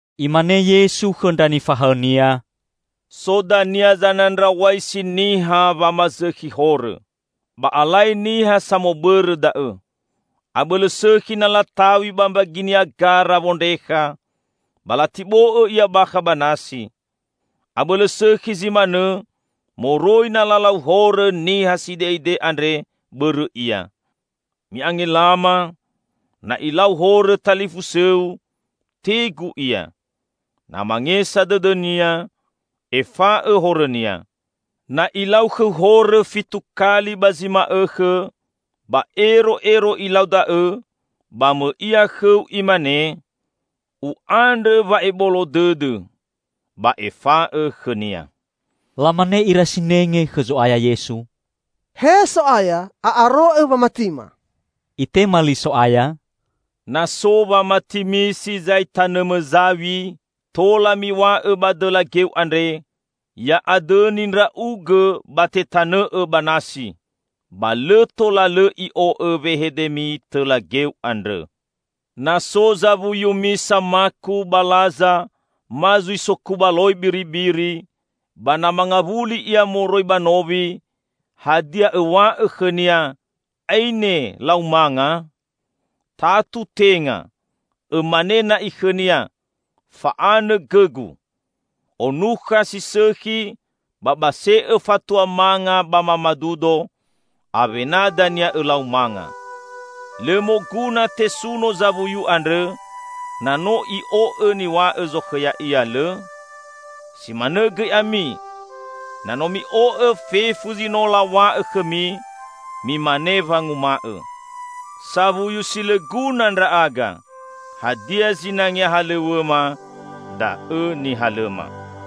Imane Yesu khõ ndra nifahaõ-Nia, "So dania zanandraw̃aisi niha wamazõkhi horõ. Ba alai niha samobõrõ da'õ! Abõlõ sõkhi na lataw̃i ba mbaginia gara wondrekha, ba latibo'õ ia bakha ba nasi. Abõlõ sõkhi zi manõ moroi na lalau horõ niha side'ide andre bõrõ ia. Mi'angelama! Na ilau horõ talifusõu, tegu ia. Na mangesa dõdõnia, efa'õ horõnia. Na ilau khõu horõ fitu kali ba zi ma'õkhõ, ba ero'ero ilau da'õ, ba mõi ia khõu imane, 'U'andrõ wa'ebolo dõdõ,' ba efa'õ khõnia." Lamane ira sinenge khõ Zo'aya Yesu, "He So'aya, a'aro'õ wamatima." Itema li So'aya, "Na so wamatimi si zai tanõmõ zaw̃i, tola miw̃a'õ ba dõla geu andre, 'Ya'adõni ndra'ugõ ba tetanõ'õ ba nasi!' ba lõ tola lõ i'o'õ wehedemi tõla geu andrõ." "Na so zawuyumi samaku ba laza ma zui sokubaloi biribiri, ba na mangawuli ia moroi ba nowi, hadia õw̃a'õ khõnia, 'Aine lau manga?' Tatu tenga! Õmane na'i khõnia, 'Fa'anõ gõgu. Onukha si sõkhi ba base'õ fatua manga ba mamadudo; awena dania õlau manga.' Lõ moguna tesuno zawuyu andrõ na no i'o'õ niw̃a'õ zokhõ ya'ia, lõ? Si manõ gõi ami. Na no mi'o'õ fefu zi no law̃a'õ khõmi, mimane wanguma'õ, 'Sawuyu si lõ guna ndra'aga, hadia zinangea halõw̃õma da'õ nihalõma.'"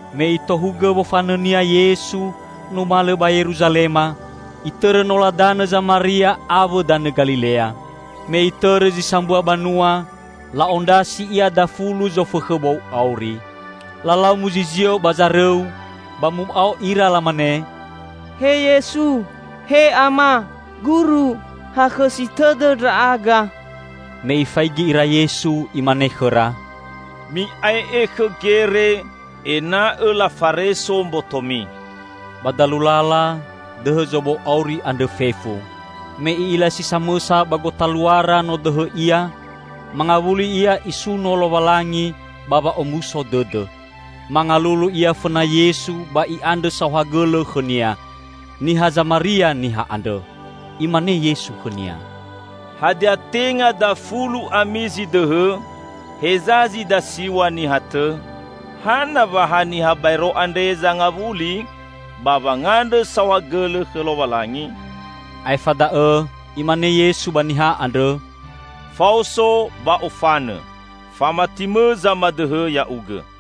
Me Itohugõ wofanõ-Nia Yesu numalõ ba Yeruzalema, Itõrõ nola danõ Zamaria awõ danõ Galilea. Me Itõrõ zi sambua banua, la'ondrasi Ia dafulu zofõkhõ bou auri. Lalau muzizio ba zarõu, ba mu'ao ira lamane, "He Yesu! He Ama, Guru! Hakhõsi tõdõ ndra'aga!" Me Ifaigi ira Yesu, Imane khõra, "Mi'ae'e khõ gere, ena'õ lafareso mbotomi." Ba dalu lala, dõhõ zobou auri andrõ fefu. Me i'ila si samõsa ba gotaluara no dõhõ ia, mangawuli ia isuno Lowalangi ba wa'omuso dõdõ. Mangalulu ia fõna Yesu ba i'andrõ saohagõlõ khõ-Nia. Niha Zamaria niha andrõ. Imane Yesu khõnia, "Hadia tenga dafulu ami zi dõhõ? Heza zi dasiw̃a niha tõ? Hana wa ha niha baero andre zangawuli ba wangandrõ saohagõlõ khõ Lowalangi?" Aefa da'õ Imane Yesu ba niha andrõ, "Faoso, ba ofanõ. Famatimõ zamadõhõ ya'ugõ."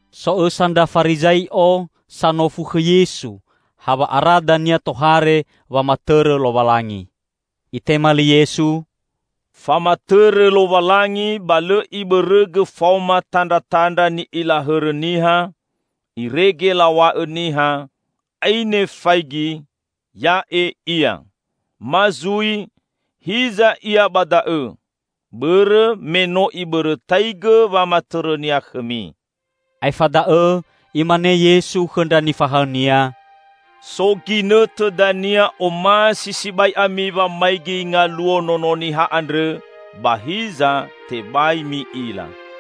So õsa ndra Farizai'o sanofu khõ Yesu ha wa'ara dania tohare wamatõrõ Lowalangi. Itema li Yesu, "Famatõrõ Lowalangi ba lõ Ibõrõgõ faoma tandratandra ni'ila hõrõ niha, irege law̃a'õ niha, 'Aine faigi, ya'e ia!' ma zui, 'Hiza ia ba da'õ!' Bõrõ me no Ibõrõtaigõ wamatõrõ-Nia khõmi." Aefa da'õ Imane Yesu khõ ndra nifahaõ-Nia, "So ginõtõ dania omasi sibai ami wamaigi ngaluo Nono Niha andrõ ba hiza tebai mi'ila.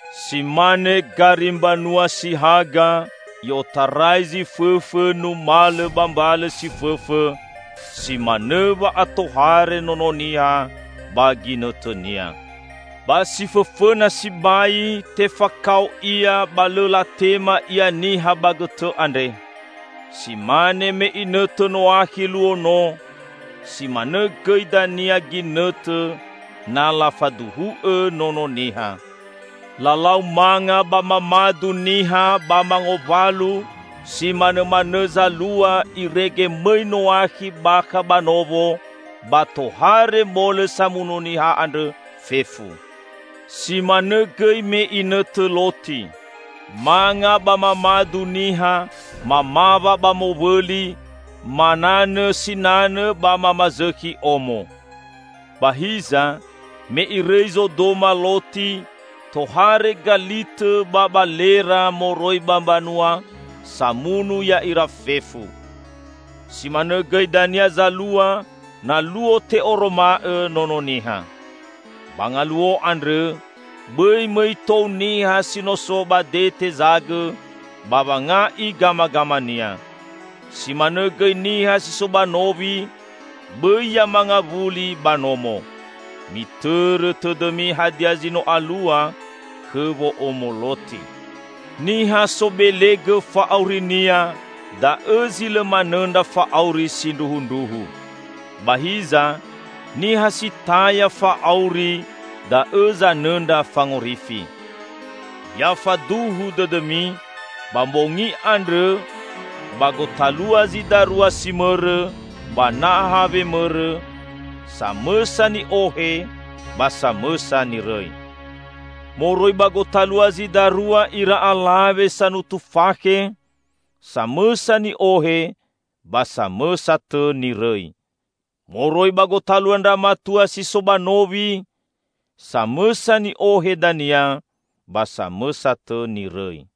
Si mane gari mbanua si haga i'otarai zi fõfõ numalõ ba mbalõ si fõfõ, si manõ wa'atohare Nono Niha ba ginõtõnia. Ba si fõfõna sibai, tefakao Ia ba lõ latema Ia niha ba gõtõ andre. Si mane me inõtõ Noakhi luo no, si manõ gõi dania ginõtõ na lafaduhu'õ Nono Niha. Lalau manga ba mamadu niha, ba mangowalu; si manõmanõ zalua irege mõi Noakhi bakha ba nowo ba tohare molõ samunu niha andrõ fefu. Si manõ gõi me inõtõ Loti. Manga ba mamadu niha, mamawa ba mowõli, mananõ sinanõ ba mamazõkhi omo. Ba hiza, me irõi Zodoma Loti, tohare galitõ ba balera moroi ba mbanua samunu ya'ira fefu. Si manõ gõi dania zalua na luo te'oroma'õ Nono Niha. Ba ngaluo andrõ, bõi mõi tou niha si no so ba dete zagõ ba wanga'i gamagamania. Si manõ gõi niha si so ba nowi, bõi ya mangawuli ba nomo. Mitõrõ tõdõmi hadia zi no alua khõ wo'omo Loti! Niha sobelegõ fa'aurinia, da'õ zi lõ manõndra fa'auri sindruhundruhu. Ba hiza niha si taya fa'auri da'õ zanõndra fangorifi. Ya faduhu dõdõmi: ba mbongi andrõ, ba gotalua zi darua si mõrõ ba naha wemõrõ, samõsa ni'ohe ba samõsa nirõi. Moroi ba gotalua zi darua ira alawe sanutu fakhe, samõsa ni'ohe ba samõsa tõ nirõi. [Moroi ba gotalua ndra matua si so ba nowi, samõsa ni'ohe dania, ba samõsa tõ nirõi.]"